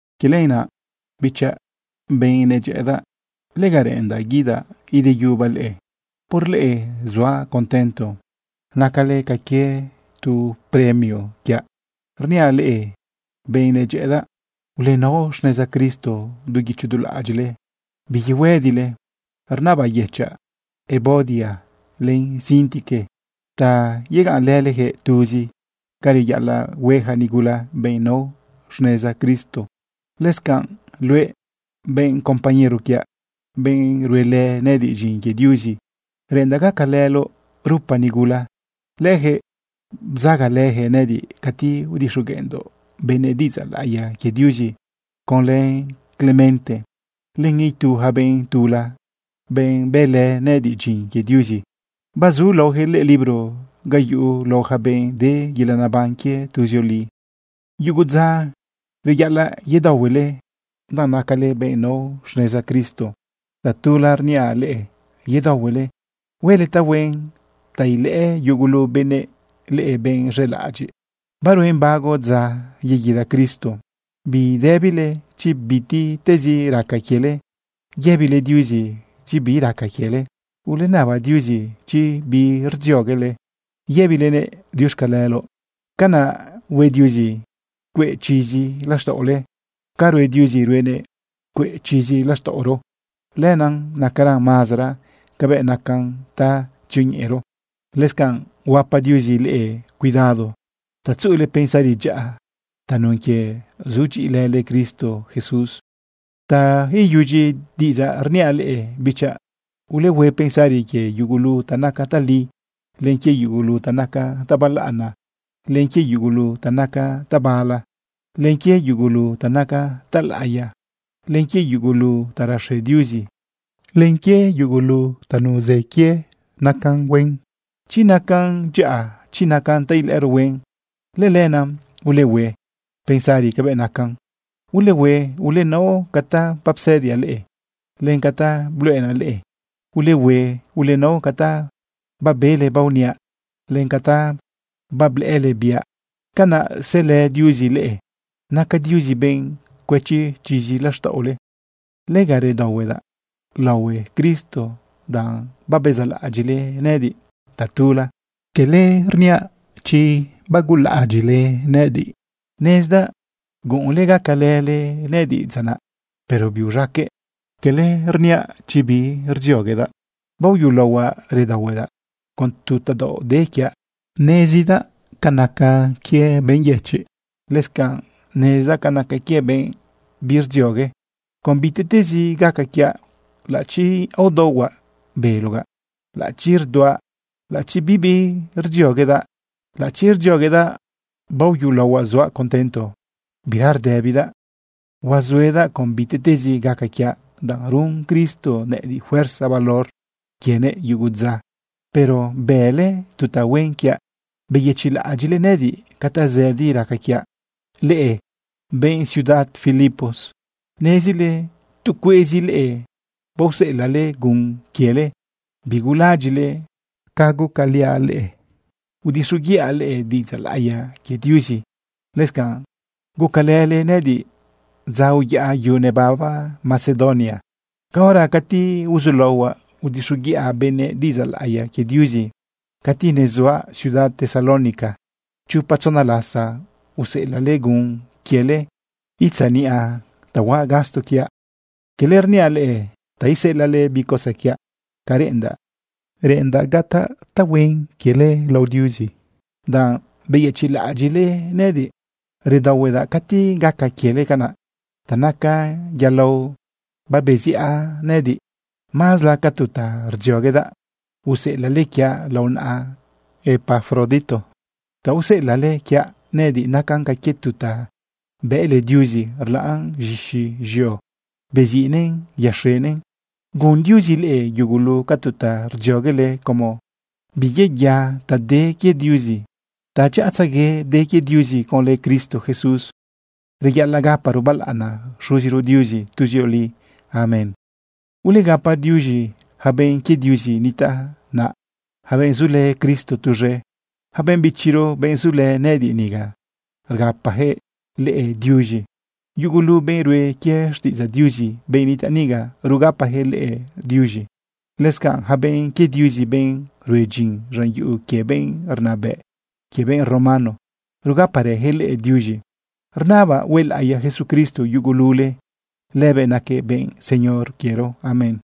Quie lenaꞌ bichaꞌ, benꞌ nedyëꞌëdaꞌ, lega reꞌendaꞌ guidaꞌ ideyubaꞌ leꞌe. Por leꞌe suaꞌ contento nacale ca quie tu premio quiaꞌ. Rniaꞌ leꞌe, benꞌ nedyëꞌëdaꞌ, ulenao xneza Cristo du guicho du laꞌadyiꞌle, biyehuëdile. Rnabayëchaꞌ Evodia len Síntique ta yegaꞌnlëleyaquëꞌ tuzi ca reyaꞌalaꞌ hue yaca nigula, benꞌ nao xneza Cristo. Lëscanꞌ luëꞌ, benꞌ compañero quiaꞌ, benꞌ ruelë nëꞌëdiꞌ dyin quie Diuzi, reꞌendaꞌ gacalëloꞌ lërupa nigula. Leyaquëꞌ bzagalëyaquëꞌ nëꞌëdiꞌ cati udixogueꞌndoꞌ benëꞌ diꞌidzaꞌ laꞌiya quie Diuzi conlë Clemente len itu yaca benꞌ tula, benꞌ bëlë nëꞌëdiꞌ dyin quie Diuzi. Bazu laoyaquëꞌ lëꞌë libro ga yuꞌu lao yaca benꞌ de yelaꞌ neban quie tuzioli. Yugu dza reyaꞌalaꞌ yedaohuele, danꞌ nacale benꞌ nao xneza Cristo. Tatula rniaꞌ leꞌe: ¡Yedaohuele! Huele tahuen ta ilëꞌë yugulu benëꞌ leꞌe benꞌ z̃elaꞌadyiꞌ. Baruen bago dza yeguida Cristo. Bidëbile chi bitiꞌtezi raca quiele. Yëbile Diuzi chi bi raca quiele. Ulenaba Diuzi chi bi rdzioguele. Yëbilenëꞌ diuxcaleloꞌ. Canaꞌ hue Diuzi cueꞌ chizi laxtaꞌole. Ca rue Diuzi, ruenëꞌ cueꞌ chizi laxtaꞌoro, lenaꞌ nacaran mazara cabëꞌ nacan ta tzioñeꞌero. Lëscanꞌ huapa Diuzi leꞌe cuidado ta tzuꞌule pensari dyaꞌa tanun quie sudyiꞌilële Cristo Jesús. Ta iyudyi diꞌidzaꞌ rniaꞌ leꞌe bichaꞌ, ulehue pensari quie yugulu ta naca tali, len quie yugulu ta naca ta balaꞌana, len quie yugulu ta naca tabala, len quie yugulu ta naca talaꞌiya, len quie yugulu ta raxe Diuzi, len quie yugulu ta nuzë quie nacan huen. Chi nacan dyaꞌa, chi nacan ta ilëꞌëro huen, lëlenaꞌ ulehue pensari cabëꞌ nacan. Ulehue ulenao ca ta bapsëdiaꞌ leꞌe, len ca ta bluꞌenaꞌ leꞌe. Ulehue ulenao ca ta babele baoniaꞌ, len ca ta bablëꞌële biaꞌ. Canaꞌ selë Diuzi leꞌe. Naca Diuzi benꞌ cuëchi chizi laxtaꞌole. Lega redaohuedaꞌ laohue Cristo danꞌ babezaꞌlaꞌadyiꞌle nëꞌëdiꞌ tatula. Cala rniaꞌ chi bagulaꞌadyiꞌle nëꞌëdiꞌ. Nezdaꞌ guꞌunle gacalële nëꞌëdiꞌ dza naꞌ, pero biuz̃aqueꞌ. Cala rniaꞌ chi bi rdzioguedaꞌ. Baoyulaohuaꞌ redaohuedaꞌ con tu tadaoꞌ de quiaꞌ. Nezdaꞌ ca naca quie benꞌ yëchiꞌ. Lëscanꞌ nezdaꞌ ca naca quie benꞌ birdziogue. Con bitiꞌtezi gaca quiaꞌ, laꞌachi aodaohuaꞌ belogaꞌ, laꞌachi rduaꞌ, laꞌachi bibi rdzioguedaꞌ, laꞌachi rdzioguedaꞌ, baoyulaohuaꞌ suaꞌ contento bira rdëbidaꞌ. Huazuedaꞌ con bitiꞌtezi gaca quiaꞌ, danꞌ run Cristo nëꞌëdiꞌ fuerza valor quienëꞌ yugu dza. Pero bële tu tahuen quiaꞌ, beyëchiꞌlaꞌadyiꞌle nëꞌëdiꞌ ca tazëdi raca quiaꞌ. Leꞌe benꞌ ciudad Filipos, nezile tu cueꞌzi leꞌe baoseꞌelaꞌle gun quiele. Bigulaꞌadyiꞌle ca gucaliaꞌ leꞌe udixoguiꞌa leꞌe diꞌidzaꞌ laꞌiya quie Diuzi. Lëscanꞌ gucalële nëꞌëdiꞌ dza uyaꞌa yu nebaba Macedonia caora cati uzulaohuaꞌ udixoguiꞌa benëꞌ diꞌidzaꞌ laꞌiya quie Diuzi. Cati nezuaꞌ ciudad Tesalónica, chopa tzona lasa useꞌelaꞌle gun quiele itzaniꞌa ta huaꞌ gasto quiaꞌ. Cala rniaꞌ leꞌe ta iseꞌelaꞌle bi cosa quiaꞌ. Ca reꞌendaꞌ, reꞌendaꞌ gataꞌ tahuen quiele lao Diuzi danꞌ beyëchiꞌlaꞌadyiꞌle nëꞌëdiꞌ. Redaohuedaꞌ cati gaca quiele canaꞌ. Ta naca yalao babeziꞌa nëꞌëdiꞌ. Mazla ca tu ta rdzioguedaꞌ useꞌelaꞌle quiaꞌ lao naꞌa Epafrodito. Ta useꞌelaꞌle quiaꞌ nëꞌëdiꞌ nacan ca quie tu ta bëꞌle Diuzi rlaꞌn z̃ixi z̃eo, beziꞌnëꞌn yaxenëꞌn. Gun Diuzi leꞌe yugulu ca tu ta rdzioguele como biyeya ta de quie Diuzi. Tadyaꞌatzegue de quie Diuzi conlë Cristo Jesús. Reyaꞌalaꞌ gaparo balaꞌana Xuziro Diuzi tuzioli. Amén. Ulegapa diuz̃i yaca benꞌ quie Diuzi nitaꞌ naꞌ, yaca benꞌ zulë Cristo tuz̃e. Yaca benꞌ bichiro, benꞌ zulë nëꞌëdiꞌ niga, rgapayaquëꞌ leꞌe diuz̃i. Yugulu benꞌ rue quie xtiꞌidzaꞌ Diuzi, benꞌ nitaꞌ niga, rugapayaquëꞌ leꞌe diuz̃e. Lëscanꞌ yaca benꞌ quie Diuzi, benꞌ rue dyin z̃an yuꞌu quie benꞌ rnabëꞌ quie benꞌ romano, rugaparëyaquëꞌ leꞌe diuz̃i. Rnabaꞌ huelaꞌiya Jesucristo yugulule. Lëbëꞌ naquëꞌ benꞌ Señor quiero. Amén.